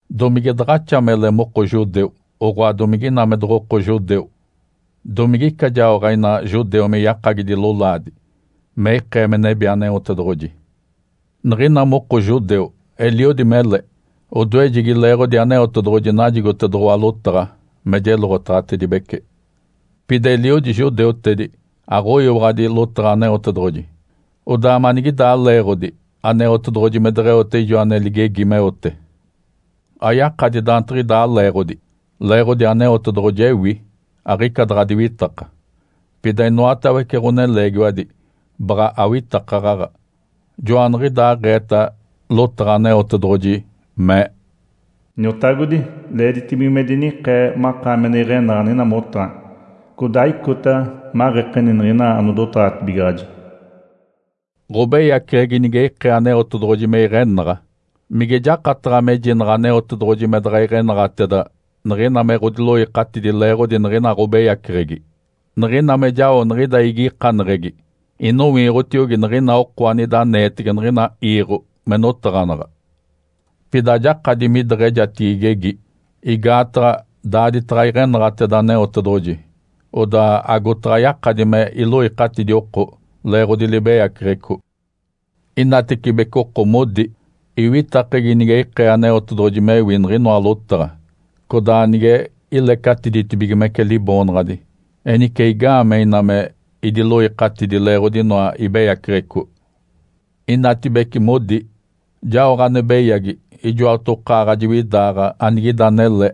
Domige daɡ̶axa mele moko judeu, oɡ̶oa domige ina me doɡ̶oko judeu? Domige ica jaoɡ̶o ina judeu me yakagidi lolaadi me ikee me nebi Aneotedoɡ̶oji? Niɡ̶ina moko judeu eliodi mele. Odoejegi leeɡ̶odi Aneotedoɡ̶oji najigotedoɡ̶owa lotaɡ̶a me jeloɡ̶otaɡ̶atedibece. Pida eliodi judeutedi aɡ̶oyiwaɡ̶adi lotaɡ̶a Aneotedoɡ̶oji. Odaa manigidaa leeɡ̶odi Aneotedoɡ̶oji me deɡ̶eote ijo ane ligegi meote? Ayakadi daantiɡ̶idaa leeɡ̶odi! Leeɡ̶odi Aneotedoɡ̶oji ewi, aɡ̶ica daɡ̶a diwitaka. Pida inoatawece ɡ̶oneleegiwadi baɡ̶a awitakaɡ̶aɡ̶a. Joaniɡ̶idaaɡ̶eeta lotaɡ̶a Aneotedoɡ̶oji, mee, “Iniotagodi, leeditibige me dinikee makaami ane iɡ̶enaɡ̶a niɡ̶ina motaɡ̶ani, codaa icota maɡ̶ekeni niɡ̶ina anodotaɡ̶atibigaɡ̶aji.” Ǥobeyaceɡ̶egi nige ikee Aneotedoɡ̶oji me iɡ̶enaɡ̶a, mige jakataɡ̶a mejinaɡ̶a Aneotedoɡ̶oji me daɡ̶a iɡ̶enaɡ̶ateda niɡ̶ina me ɡ̶odiloikatidi leeɡ̶odi niɡ̶inoa ɡ̶obeyaceɡ̶egi? Niɡ̶ina me jao niɡ̶ida igikaneɡ̶egi, inowiiɡ̶otiogi niɡ̶ina oko anida aneetege niɡ̶ina iiɡ̶o me notaɡ̶anaɡ̶a. Pida ajakadi mideɡ̶ejatigi igegi. Igaataɡ̶a daaditaɡ̶a iɡ̶enaɡ̶ateda Aneotedoɡ̶oji, odaa agotaɡ̶a yakadi me iloikatidi oko leeɡ̶odi libeyaceɡ̶eco. Inatecibece oko modi, “Iwitakegi nige ikee Aneotedoɡ̶oji mewi niɡ̶inoa lotaɡ̶a, codaa nige ilecatiditibigimece Liboonaɡ̶adi, enice igaamee ina me idiloikatidi leeɡ̶odi inoa ibeyaceɡ̶eco?” Inatibece modi, “Jaoɡ̶a ane beyagi ijoatokaaɡ̶a jiwidaaɡ̶a anigida anele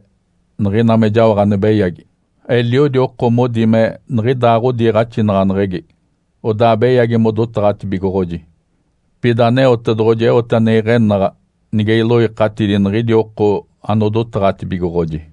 niɡ̶ina me jaoɡ̶a ane beyagi.” Eliodi oko modi me niɡ̶idaa ɡ̶odiiɡ̶axinaɡ̶aneɡ̶egi, odaa beyagi modotaɡ̶atibigoɡ̶oji. Pida Aneotedoɡ̶oji eote ane iɡ̶enaɡ̶a nige iloikatidi niɡ̶idi oko anodotaɡ̶atibigoɡ̶oji.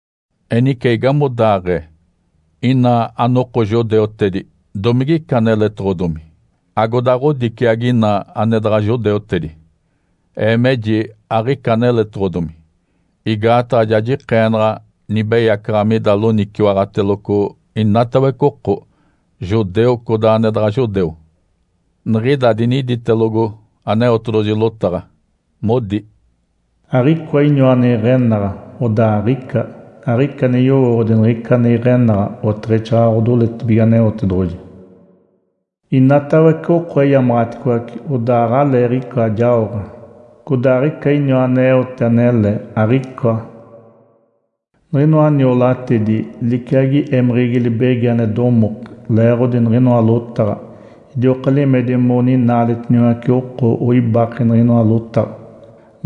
Enice igamodaaɡ̶ee? Ina anoko judeutedi domigica aneletoɡ̶odomi agoda ɡ̶odiciagi ina ane daɡ̶a judeutedi? Ee meji aɡ̶ica aneletoɡ̶odomi! Igaataɡ̶a ja jikeenaɡ̶a nibeyacaɡ̶a mida loniciwaɡ̶ateloco inatawece oko, judeu, codaa ane daɡ̶a judeu. Niɡ̶ida diniditelogo Aneotedoɡ̶oji lotaɡ̶a, modi, “Aɡ̶icoa iniwa ane iɡ̶enaɡ̶a. Odaa aɡ̶ica! Aɡ̶ica ane yowooɡ̶odi niɡ̶ica ane iɡ̶enaɡ̶a, oteɡ̶exaaɡ̶aɡ̶a odoletibige Aneotedoɡ̶oji. Inatawece oko eyamaɡ̶aticoace, odaa aɡ̶aleeɡ̶ica jaoɡ̶a. Codaa aɡ̶icoa iniwa aneote anele. Aɡ̶icoa! Niɡ̶inoa niolatedi liciagi émeɡ̶egi libegi ane domoke (leeɡ̶odi niɡ̶inoa lotaɡ̶a). Idioka limedi moninaaletiniwace oko oibake niɡ̶inoa lotaɡ̶a.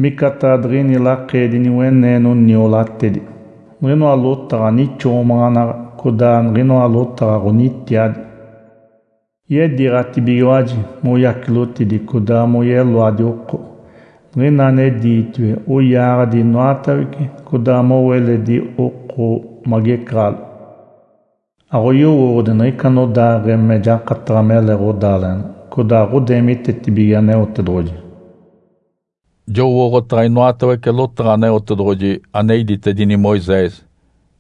Micataɡ̶a diɡ̶ini lakeedi niweneeno niolatedi. Niɡ̶inoa lotaɡ̶a nixoomaɡ̶anaɡ̶a codaa niɡ̶inoa lotaɡ̶a ɡ̶onitiadi. Yediiɡ̶atibigiwaji moyacilotidi codaa moyeloadi oko. Niɡ̶ina ane diitiwe oyaaɡ̶adi inoatawece, codaa mowo eledi oko magecaɡ̶alo. Aɡ̶oyowooɡ̶odi niɡ̶ica anodaaɡ̶ee me jakataɡ̶a mele ɡ̶odaaleɡ̶ena. Codaa aɡ̶odeemitetibige Aneotedoɡ̶oji.” Jowooɡ̶otaɡ̶a inoatawece lotaɡ̶a Aneotedoɡ̶oji ane iditedini Moisés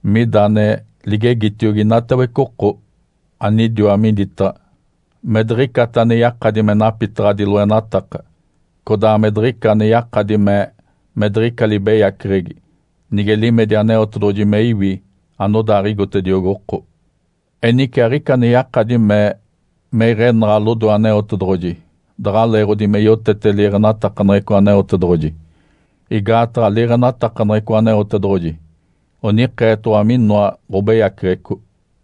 mida ane ligegitiogi inatawece oko anidiwa miditaɡ̶a me diɡ̶icata ane yakadi me napitaɡ̶adi loenataka, codaa me diɡ̶ica ane yakadi mee me diɡ̶ica libeyaceɡ̶egi nige limedi Aneotedoɡ̶oji me iwi anodaaɡ̶igotediogi oko. Enice aɡ̶ica ane yakadi mee me iɡ̶enaɡ̶a lodoe Aneotedoɡ̶oji daɡ̶a leeɡ̶odi me yotete liiɡ̶enatakaneɡ̶eco Aneotedoɡ̶oji. Igaataɡ̶a liiɡ̶enatakaneɡ̶eco Aneotedoɡ̶oji onikeetoɡ̶owa minoa ɡ̶obeyaceɡ̶eco.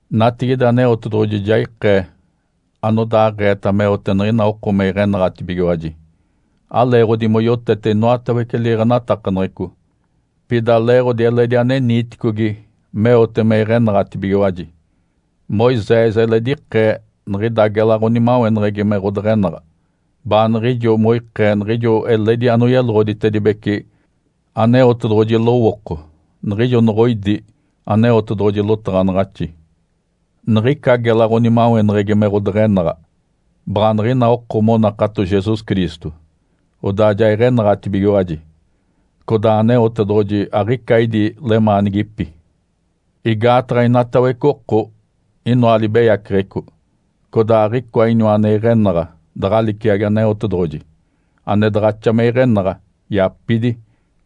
Natigide Aneotedoɡ̶oji ja ikee anodaaɡ̶eeta meote niɡ̶ina oko me iɡ̶enaɡ̶atibigiwaji. Aleeɡ̶odi moyotete inoatawece liiɡ̶enatakaneɡ̶eco, pida leeɡ̶odi eledi ane niiticogi meote me iɡ̶enaɡ̶atibigiwaji. Moisés eledi ikee niɡ̶ida gela ɡ̶onimaweneɡ̶egi me ɡ̶odeɡ̶enaɡ̶a, baaniɡ̶ijo moikee niɡ̶ijo eledi anoyeloɡ̶oditedibece Aneotedoɡ̶oji lowooko niɡ̶ijo noɡ̶oidi Aneotedoɡ̶oji lotaɡ̶anaɡ̶axi. Niɡ̶ica gela ɡ̶onimaweneɡ̶egi me ɡ̶odeɡ̶enaɡ̶a baɡ̶a niɡ̶ina oko monakato Jesus Cristo, odaa ja iɡ̶enaɡ̶atibigiwaji. Codaa Aneotedoɡ̶oji aɡ̶ica idi lemaanigipi. Igaataɡ̶a inatawece oko inoa libeyaceɡ̶eco, codaa aɡ̶icoa iniwa ane iɡ̶enaɡ̶a daɡ̶a liciagi Aneotedoɡ̶oji, ane daɡ̶axa me iɡ̶enaɡ̶a, yapidi,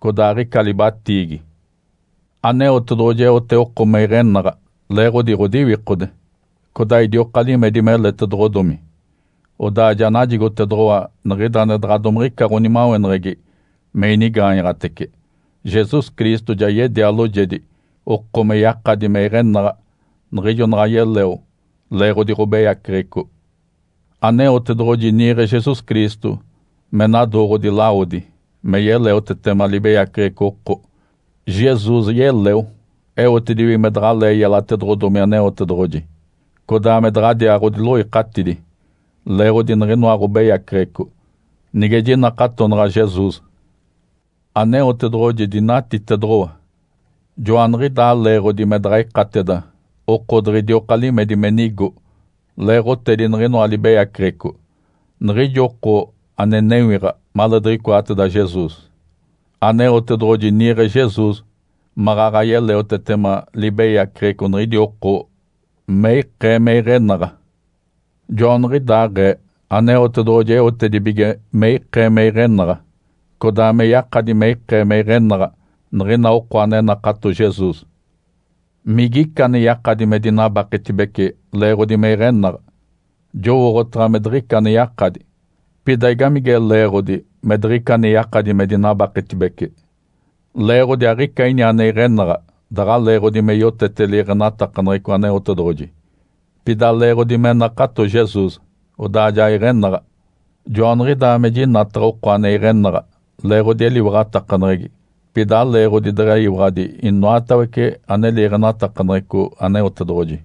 codaa aɡ̶ica libatiigi. Aneotedoɡ̶oji eote oko me iɡ̶enaɡ̶a leeɡ̶odi ɡ̶odiwikode, codaa idioka limedi meletedoɡ̶odomi, odaa ja najigotedoɡ̶owa niɡ̶ida ane daɡ̶a domiɡ̶ica ɡ̶onimaweneɡ̶egi me inigaanyaɡ̶atece. Jesus Cristo ja yedia loojedi oko me yakadi me iɡ̶enaɡ̶a niɡ̶ijo naɡ̶a yeleo leeɡ̶odi ɡ̶obeyaceɡ̶eco. Aneotedoɡ̶oji niiɡ̶e Jesus Cristo me nadooɡ̶odi lawodi me yeleotetema libeyaceɡ̶eco oko. Jesus yeleo eotedibige me daɡ̶alee yelatedoɡ̶odomi Aneotedoɡ̶oji, codaa me daɡ̶adiaa ɡ̶odiloikatidi leeɡ̶odi niɡ̶inoa ɡ̶obeyaceɡ̶eco, nige jinakatonaɡ̶a Jesus. Aneotedoɡ̶oji dinatitedoɡ̶owa, joaniɡ̶idaa leeɡ̶odi me daɡ̶a ikateda oko diɡ̶idioka limedi me nigo leeɡ̶otedi niɡ̶inoa libeyaceɡ̶eco, niɡ̶ijo oko ane newiɡ̶a maleediɡ̶icoateda Jesus. Aneotedoɡ̶oji niiɡ̶e Jesus maɡ̶aɡ̶a yeleotetema libeyaceɡ̶eco niɡ̶idi oko me ikee me iɡ̶enaɡ̶a. Joaniɡ̶idaaɡ̶ee Aneotedoɡ̶oji eotedibige me ikee me iɡ̶enaɡ̶a, codaa me yakadi me ikee me iɡ̶enaɡ̶a niɡ̶ina oko ane nakato Jesus. Migica ane yakadi me dinabaketibece leeɡ̶odi me iɡ̶enaɡ̶a? Jowooɡ̶otaɡ̶a me diɡ̶ica ane yakadi! Pida igamige leeɡ̶odi me diɡ̶ica ane yakadi me dinabaketibece? Leeɡ̶odi aɡ̶ica ini ane iɡ̶enaɡ̶a daɡ̶a leeɡ̶odi me yotete liiɡ̶enatakaneɡ̶eco Aneotedoɡ̶oji, pida leeɡ̶odi me nakato Jesus, odaa ja iɡ̶enaɡ̶a. Joaniɡ̶idaa me jinataɡ̶a oko ane iɡ̶enaɡ̶a leeɡ̶odi eliwaɡ̶atakaneɡ̶egi, pida aleeɡ̶odi deɡ̶eyiwaɡ̶adi inoatawece ane liiɡ̶enatakaneɡ̶eco Aneotedoɡ̶oji.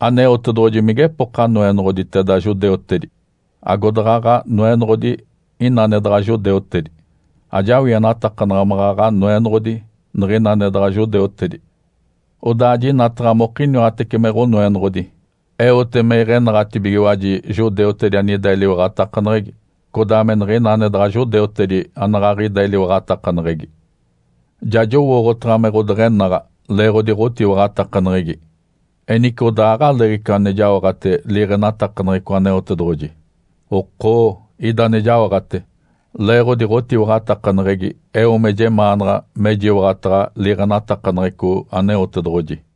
Aneotedoɡ̶oji migepoka Noenoɡ̶oditeda judeutedi? Agodaɡ̶aɡ̶a Noenoɡ̶odi ina ane daɡ̶a judeutedi? Ajawienatakanaɡ̶a maɡ̶aɡ̶a Noenoɡ̶odi niɡ̶ina ane daɡ̶a judeutedi. Odaa jinataɡ̶a mokiniwatece me Ǥonoenoɡ̶odi. Eote me iɡ̶enaɡ̶atibigiwaji judeutedi anida eliwaɡ̶atakaneɡ̶egi, codaa me niɡ̶ina ane daɡ̶a judeutedi anaɡ̶aɡ̶ida eliwaɡ̶atakaneɡ̶egi. Ja jowooɡ̶otaɡ̶a me ɡ̶odeɡ̶enaɡ̶a leeɡ̶odi ɡ̶otiwaɡ̶atakaneɡ̶egi. Enice, odaa aɡ̶aleeɡ̶ica ane jaoɡ̶ate liiɡ̶enatakaneɡ̶eco Aneotedoɡ̶oji? Okoo, ida ane jaoɡ̶ate! Leeɡ̶odi ɡ̶otiwaɡ̶atakaneɡ̶egi eo me jemaanaɡ̶a mejiwaɡ̶ataɡ̶a liiɡ̶enatakaneɡ̶eco Aneotedoɡ̶oji.